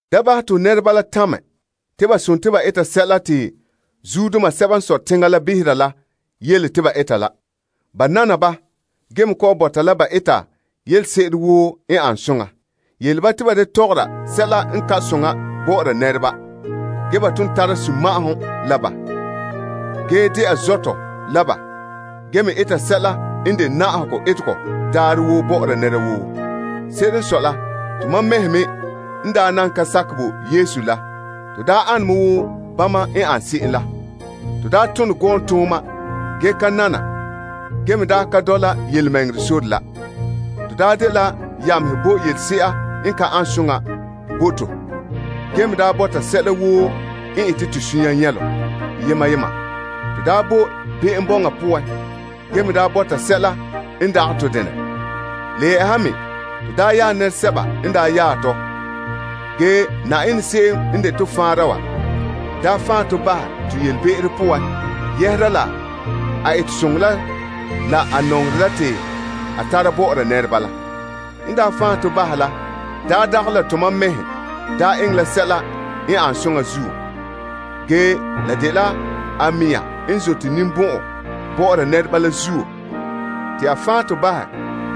Da bahɛ te ho nɛreba la tamɛ te ba sontii ba eta sɛla te zuodoma sɛba n sɔe teŋa la behera la yele te ba eta la. Ba nana ba ge me kɔ'ɔn bɔta la ba eta yelese'ere woo n ane soŋa. Yele ba te ba da tɔgɔra sɛla n ka an soŋa bɔ'ɔra nɛreba. Ge ba ton tara sunma'ahom la ba ge dɛna zɔtɔ la ba ge me eta sɛla n de na'ahegɔ etegɔ daarɛ woo bɔ'ɔra nɛra woo. Se'ere n sɔe la, tomam mɛhe me n daa nan ka sakɛ bo Yesu la, to daa ane me wo bama n an se'em la. To daa tone gɔɔntooma ge ka nana ge me daa ka dɔla yelemɛŋɛrɛ sore la. To daa dela yamehe bo yelese'a n ka an soŋa bo to gee me daa bɔta sɛla woo n ete to sunya nyɛlom yema yema. To daa boe be'em bɔŋa poan gee me daa bɔta sɛla n dagɛ to denɛ. Le yɛ'ɛha me to daa yaɛ nɛresɛba n daa yaɛ tɔ. Ge Na'ayenɛ se'em n de to faanra wa daa fan' tɔ bahɛ to yelebe'ero poan yɛhera la a etesoŋɔ la la a nɔŋerɛ la te a tara bɔ'ɔra nɛreba la. N daa fan' to bahɛ la daa dagɛ la tom mam mɛhe daa eŋɛ la sɛla n an soŋa zuo. Ge, la dela a mɛŋa n zote ninbɔn'ɔn bɔ'ɔra nɛreba la zuo te a fan' to bahɛ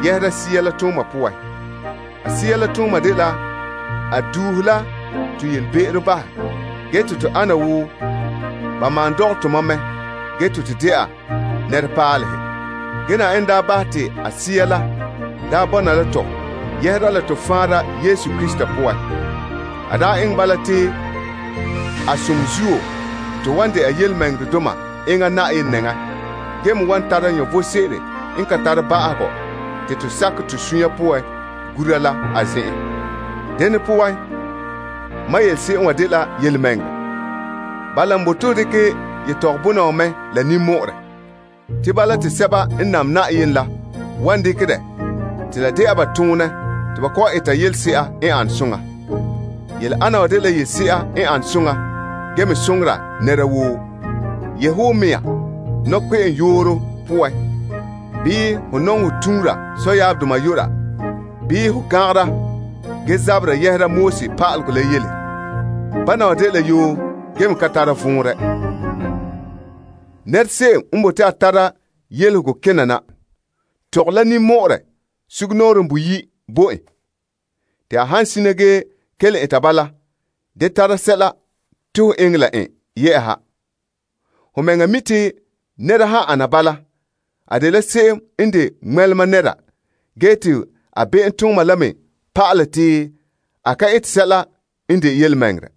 yɛhera Sea la tooma poan. A Sea la tooma la dela a duuhe la to yelebe'ero bahɛ ge te to ana wo ba malom dɔgɛ tomam mɛ ge te to dɛna nɛrepaalehe. Ge Yenɛ daa bahɛ te a Sea la daa bɔna la tɔ yɛhera la to Faanra Yesu Krista poan. A daa eŋɛ bala te a zo'ohogɔ zuo to wan dɛna tontɔɔdoma enŋa Yenɛ nɛŋa ge me wan tara vom sebo n ka tare ba'ahegɔ te to sakɛ to suunre poan gura la a zen'en. Dene poan, mam yele se'em wa dela yelemɛŋɛrɛ. Bala n bote ho dekɛ yetɔgɔbɔna wa mɛ la ninmɔ'ɔrɛ. Te bala te sɛba n nam Yenɛ la wan dekɛ dɛ te la dɛna ba toonɛ te ba kɔ'ɔn eta yelese'a n ane soŋa. Yele ana wa dela yelese'a n ane soŋa ge me soŋora nɛra woo. Yehe ho mɛŋa nɔkpe'enyooro poan bii ho nɔŋɛ ho tuura sɔyaabdoma yu'ura, bii ho gan'angera ge zabera yɛhera pa'alegɔ la yele. Bana wa dela yoo gee me ka tara vɔnrɛ. Nɛra se'em n bote a tare yelehego kena na, tɔgɛ la ninmɔ'ɔrɛ sugumnɔɔren boyi' bo en. Te a han sina gee kelom eta bala, da tara sɛla te ho eŋɛ la en yɛ'ɛha. Ho mɛŋa mi' te nɛra han ana bala, a dela se'em n de ŋmɛlema nɛra ge te a be'emtooma la me pa'alɛ te a ka ete sɛla n de yelemɛŋɛrɛ.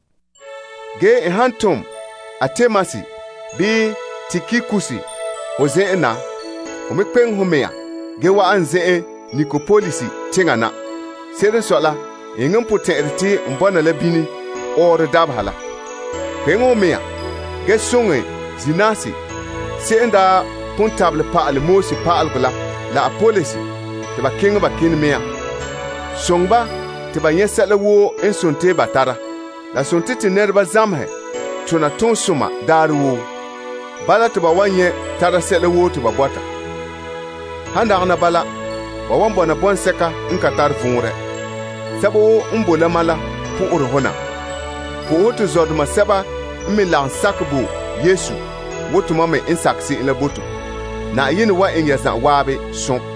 Ge n han tom Artemas bii Tikikus ho zen'en na, hon me kpeŋe ho mɛŋa ge wa'an n zen'en Nikopolis teŋa na. Se'ere n sɔe la, n eŋɛ n potɛn'ɛrɛ te n bɔna la bini ɔɔrɔ dabeha la. Kpeŋe ho mɛŋa ge soŋɛ Zenas se'em n daa pon tabelɛ pa'ala Moses pa'alegɔ la la Apolos te ba keŋɛ ba kene mea. Soŋɛ ba te ba nyɛ' sɛla woo n sontii ba tara. La sontii to nɛreba zamehɛ tona toonsoma daarɛ woo. Bala te ba wan tara sɛla woo te ba bɔta. Han dagana bala, ba wan bɔna bɔŋsɛka n ka tare vɔnrɛ. Sɛba woo n boe la mam la po'ohere ho na. Po'ohɛ to zɔdoma sɛba n me lagom sakɛ bo Yesu wo tomam me n sakɛ se'em la bo to. Yenɛ zo'ohogɔ bɔna la ya zan'an.